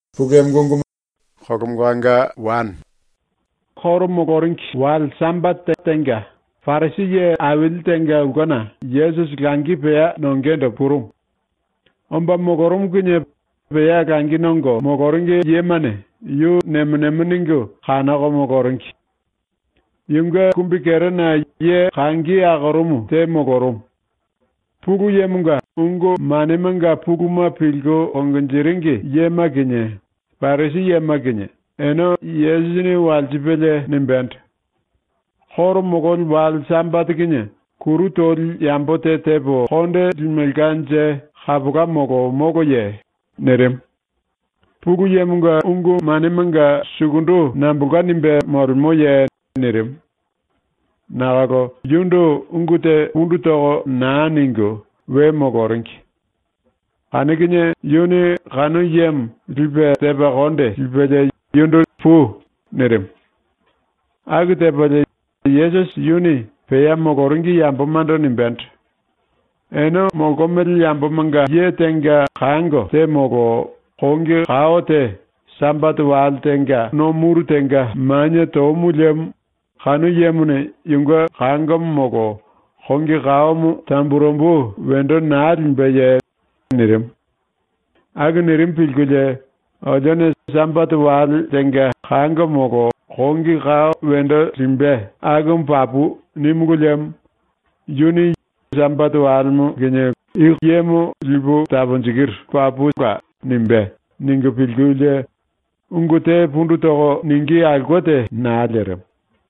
⸤Juda yambomanga koro moloringi⸥ wale Sambate tenga Parisi ye aili tenga ulkena Yesusi langi pea nongendo purumu. Omba molorumu kinie pea langi nongo moloringi yemane yu nemo nemo ningu kanoko moloringi. Yunge kumbikerena ye kangi akorumu te molorumu. Pulu Yemonga ungu manemanga puluma pilku konjiringi yema kinie, Parisi yema kinie, ene Yesusini walsipelie nimbendo: “⸤Koro mololi⸥ wale Sambate kinie kuru toli yambo te tepo konde limelkanje kapola molo moloye?” nirimu. “Pulu Yemonga ungu manemanga sukundu nambolka nimbe molemoye?” nirimu. Nakolo yundu ungu te pundu toko naa ningu we moloringi. Kanu kinie yuni kanu yemo lipe tepa konde lipelie yundu “Pui.” nirimu. Aku tepalie Yesusi yuni pea moloringi yambomando nimbendo: “Ene molkomele yambomanga ye tenga kango te molo kongi kao te Sambate wale tenga no muru tenga manie tomu liemo kanu yemone yunge kangomo molo kongi kaomo tamburembu wendo naa limbeye?” nirimu. Aku nirimu pilkulie ‘Olione “Sambate wale tenga kango molo kongi kao wendo limbe akumu papu.” nímulu liemo yuni “Yemo papu Sambate walemo kinie lipu taponjikiru.” nimbe.’ ningu pilkulie ungu te pundu toko ningí aulke te naa lerimu.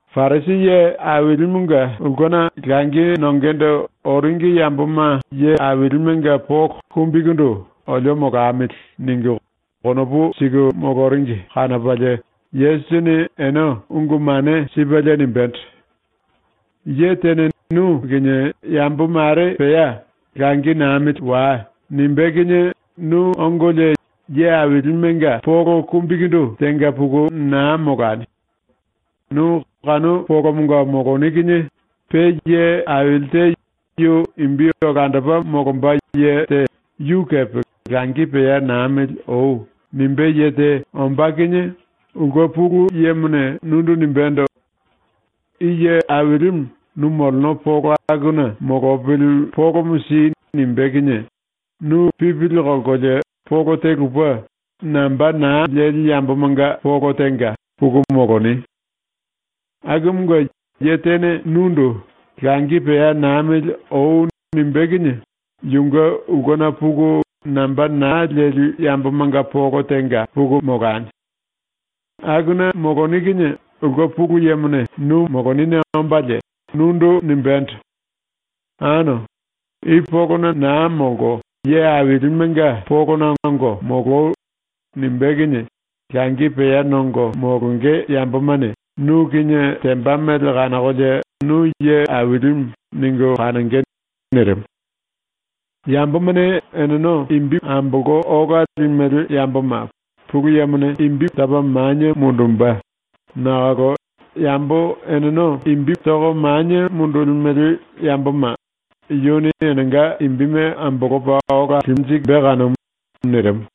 Parisi ye ailimunge ulkena langi nongendo oringi yamboma ye ailimenga polo kumbikundu ‘olio molamili.’ ningu konopu siku moloringi kanopalie Yesusini ene ungu mane sipelie nimbendo: “Ye tene nu kinie yambo mare pea “Langi namili wai.” nimbé kinie nu ongolie ye ailimenga polo kumbikundu tenga puku naa molani. Nu kanu polomonga moloni kinie pe ye aili te yu imbi olandopa molomba ye te yu kepe ‘Langi pea namili oi.’ nimbé ye te ombá kinie ulke pulu yemone nundu nimbendo: “I ye ailimu nu moleno polo akuna molopili polomo si.” nimbé kinie nu pipili kolkolie polo te lupe, namba naa leli yambomanga polo tenga puku moloni. “Akumunge, ye tene nundu “Langi pea namili oi.” nimbé kinie yunge ulkena puku namba naa leli yambomanga polo tenga puku molani. Akuna moloni kinie ulke pulu yemone nu molonine ombalie nundu nimbendo: “Ano, i polona naa molko ye ailimenga polona ongo moloi.” nimbé kinie langi pea nongo molonge yambomane nu kinie temba mele kanokolie nu ‘Ye ailimu.’ ningu kanonge.” nirimu. “Yambomane eneno imbime ambolko ola limele yamboma ⸤Pulu Yemone⸥ topa manie mundumbe, nakolo yambo eneno toko manie mundulimele yamboma yuni enenga imbime ambolopa ola limbe kanumu.” nirimu.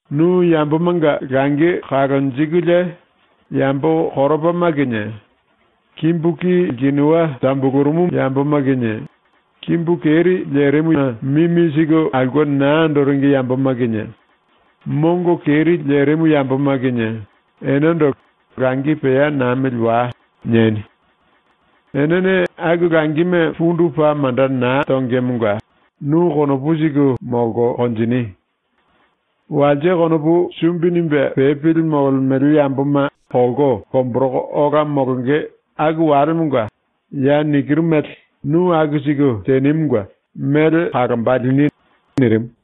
Nu yambomanga langi kalonjikulie yambo koropama kinie, kimbu ki lkinuwa tambulurumu yamboma kinie, kimbu keri lerimuna mimi siku aulke naa andoringi yamboma kinie, mongo keri lerimu yamboma kinie enendo ‘Langi pea namili wai.’ nieni. Enene aku langime pundu paa manda naa tongemonga nu konopu siku molko konjini. Walse konopu sumbi nimbe pepili molemele yamboma kolko lomboroko ola molonge aku walemonga ya nikiru mele nu aku siku tenimunge mele kalomba lini.” nirimu.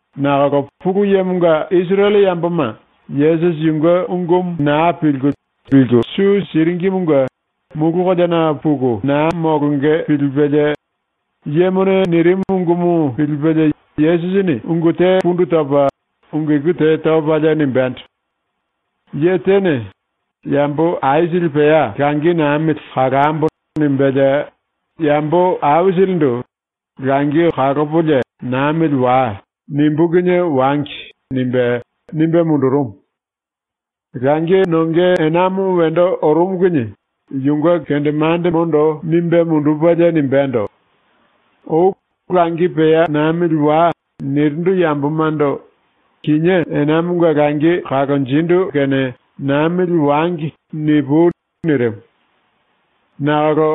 Nakolo Pulu Yemonga Isirele yamboma Yesusi yunge ungumu naa pilku liku su siringimunge mulu koleana puku naa molonge pilipelie yemone nirimu ungumu pilipelie Yesusini ungu te pundu topa ungu iku te topalie nimbendo: “Ye tene ‘Yambo aisili pea langi namili kalambo.’ nimbelie yambo aisilindu “‘Langi kalopolie namili wai.’ nimbú kinie wangi.” nimbe, nimbe mundurumu. Langi nonge enamo wendo orumu kinie yunge kendemandemondo nimbe mundupelie nimbendo: “Oi “Langi pea namili wai.” nirindu yambomando “Kinié enamonga langi kalonjindu kene namili wangi.” nipui.” nirimu. Nakolo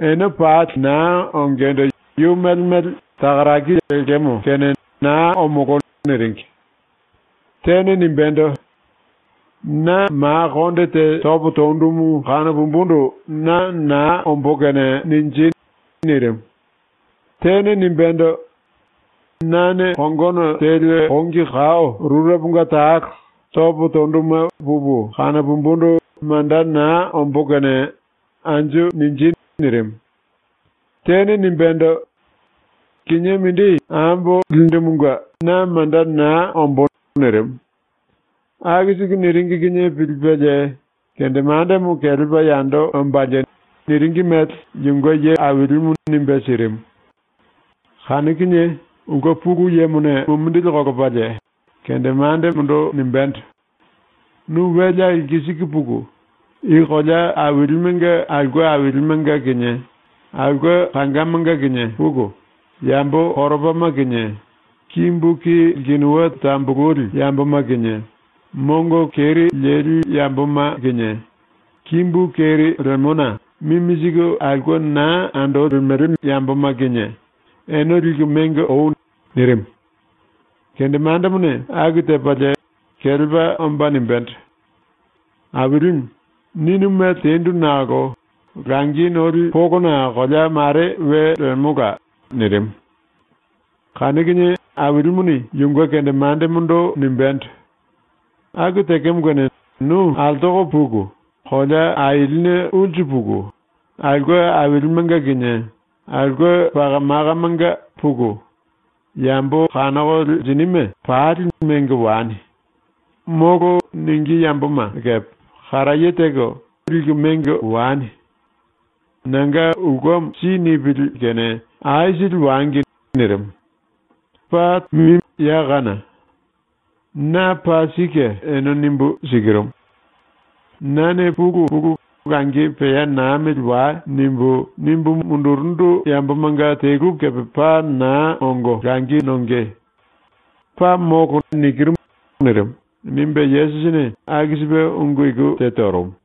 ene pali naa ongendo yu mele mele “Takaraki lekemo kene naa omolo.” niringi. Tene nimbendo: “Na ma konde te topo tondumu kanopumbundu na naa ombó kene ninji.” nirimu. Tene nimbendo: “Nane kongono teli kongi kao rureponga talo topo tonduma pupu kanopumbundu manda naa ombó kene ninji.” nirimu. Tene nimbendo: “Kinié mindi ambo lindumunge na manda naa ombó.” nirimu. ⸤Aku siku niringi kinie pilipelie⸥ kendemandemo kelepa yando ombalie niringi mele yunge ye ailimu nimbe sirimu. Kanu kinie ulke pulu yemone mumindili kolopalie kendemandemondo nimbendo: “Nu welea lkisiku puku, i kolea ailimunge aulke ailimenga kinie aulke kangamanga kinie puku, yambo koropama kinie kimbu ki lkinuwa tambulurumu yamboma kinie, mongo keri lerimu yamboma kinie kimbu keri lerimuna mimi siku aulke naa andoringi yamboma kinie, ene liku mengo oi.” nirimu. Kendemandemone aku tepalie kelepa omba nimbendo: “Ailimu, ninu mele tendu nakolo langi noli polona kolea mare we lemola.” nirimu. Kanu kinie Ailimuni yunge kendemandemondo nimbendo: “Aku tekemo kene nu altoko puku, kolea ailine ulsu puku aulke ailimenga kinie aulke paka makamanga puku, yambo kanoko lenjinime pali mengo wani. “Molo.” ningí yamboma kepe karaye teko mengo wani. Nanga ulkemo si nipili kene aisili wangi.” ⸤nirimu.⸥ “Paa tambu ya kana. Na paa sike ene nimbu sikirumu: Nane pulu pulu “Langi pea namili wai.” nimbu, nimbu mundurundu yambomanga telu kepe paa naa ongo langi nonge. Paa molo.” nirimu.” nimbe ⸤Yesusini aku sipe ungu iku te torumu.⸥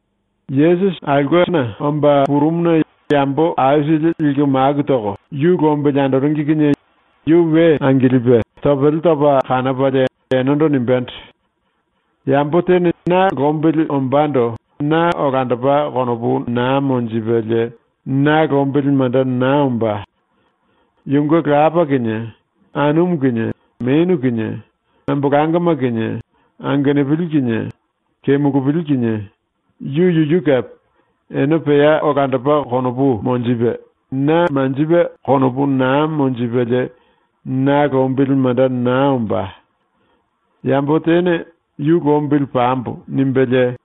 Yesusi aulkena omba purumuna yambo aisili liku maku toko yu lombili andoringi kinie yu we angilipe topele topa kanopalie enendo nimbendo: “Yambo tene na lombili ombando na olandopa konopu naa monjipelie na lombili manda naa ombá. Yunge lapa kinie, anumu kinie, menu kinie, ambolangoma kinie, angenupili kinie, kemulupili kinie, yu yuyu kepe, ene pea olandopa konopu monjipe, na manjipe konopu naa monjipelie na lombili manda naa ombá. Yambo tene ‘Yu lombili pambo.’ nimbelie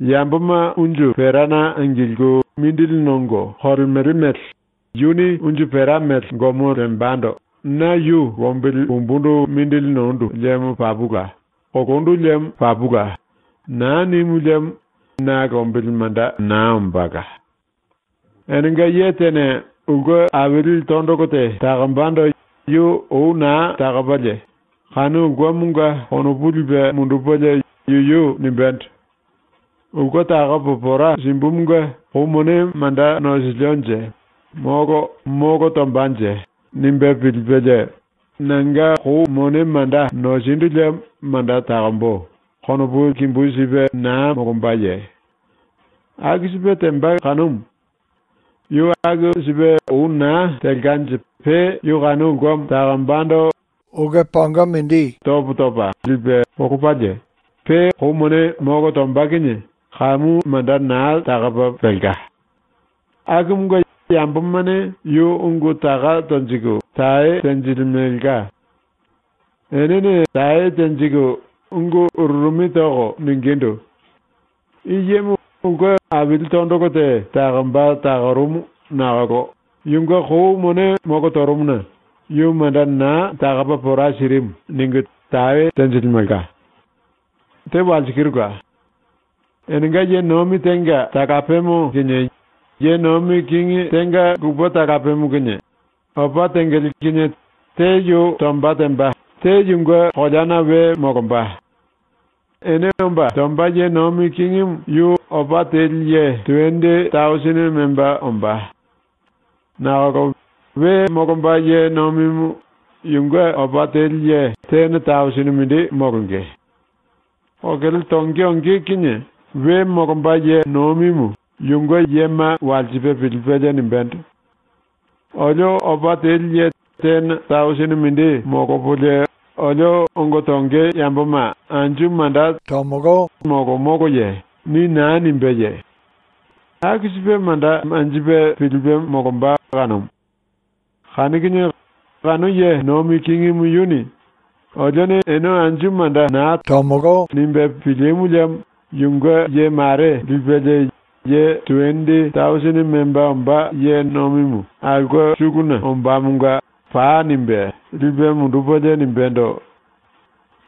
yamboma unju perana angilku mindili nongo kolemele mele yuni unju pera mele gomo lembando ‘Na yu lombili pumbundu mindili nondu liemo papula; kolondu liemo papula.’ naa nimu liemo na lombili manda naa ombála. “Enenga ye tene ulke aili tondolo te takombando yu ou naa takopalie kanu ulkemonga konopu lipe mundupelie yuyu nimbendo: ‘Ulke takopo pora simbumunge kou mone manda nosilionje molo molo tombanje?’ nimbe pilipelie ‘Nanga kou mone manda nosindu liemo manda takombo.’ konopu kimbu sipe naa molombaye? ⸤Aku sipe temba kanumu.⸥ Yu aku sipe ou naa telkanje pe yu kanu ulkemo takombando unju pote mindi topo topa lipe polopalie pe kou mone molo tomba kinie kamu manda naa takopa pelka. Akumunge yambomane yu ungu taka tonjiku tae tenjilimelka. Enene tae tenjiku ungu ururumi toko ningindu: “I yemo ulke aili tondolo te takomba takorumu nakolo yunge kou mone molo torumuna yu manda naa takopa pora sirimu.” ningu tae tenjilimelka. “⸤Te walsikirula.⸥ Enenga ye nomi tenga talapemo kinie ye nomi kingi tenga lupe talapemo kinie opa tengele kinie te yu tomba temba, te yunge koleana we molomba. Ene omba tomba ye nomi kingimu yu opa teli ye tuwendi tausini memba ombá. Nakolo we molomba ye nomimu yunge opa teli ye tene tausini mindi molonge. Kokele tonge onge kinie we molomba ye nomimu yunge yema walsipe pilipelie nimbendo: “Olio opa teli ye tene tausini mindi molopolie olio ongo tonge yamboma anju manda tamili molo moloye?” ni naa nimbéye? ⸤Aku sipe manda manjipe pilipe molomba kanumu.⸥ Kanu kinie kanu ye nomi kingimu yuni ‘Olione ene anju manda naa tamili.’ nimbe pilimu liemo yunge ye mare lipelie, ye tuwendi tausini memba ombá ye nomimu aulke suluna ombámonga “Pai.” nimbe lipe mundupelie nimbendo: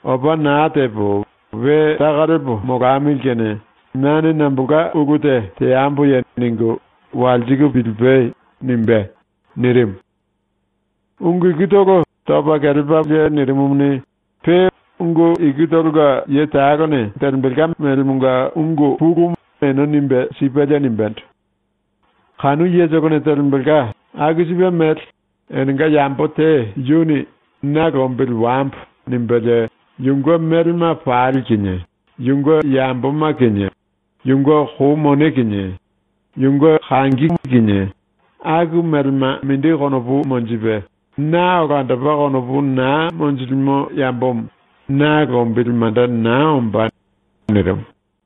“‘Opa naa tepo we taka lepo molamili kene nane nambolka ulu te teamboye?’ ningu walsiku pilipai.” nimbé.” ⸤nirimu.⸥ ⸤Ungu ikutolo topa kelepalie nirimumuni, pe ungu ikutolonga ye talone telembelka melemonga ungu pulumu ene nimbe sipelie nimbendo:⸥ “⸤Kanu yetolone telembelka⸥ aku sipe mele enenga yambo te yuni ‘Na lombili wambo.’ nimbelie yunge melema pali kinie, yunge yamboma kinie, yunge kou mone kinie, yunge kangi kinie, aku melema mindi konopu monjipe na olandopa konopu naa monjilimo yambomo na lombili manda naa ombá.” ⸤nirimu.⸥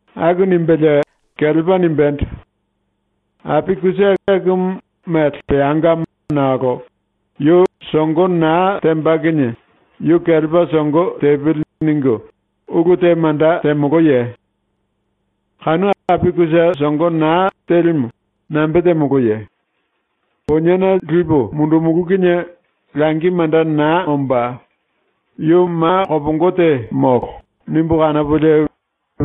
⸤Aku nimbelie kelepa nimbendo:⸥ “Api kusa akumu mele peangamo nakolo yu songo naa temba kinie ‘Yu kelepa songo tepili.’ ningu ulu te manda temoloye? Kanu api kusa songo naa telimu nambe temoloye? ‘Poniena lipu mundumulú kinie langi manda naa ombá; yu ma kopongo te molo.’ nimbu kanopolie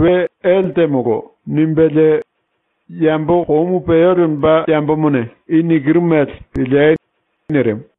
we ele temolo.” ⸤nimbelie⸥ “Yambo komu peo lemba yambomane i nikiru mele piliei.” nirimu.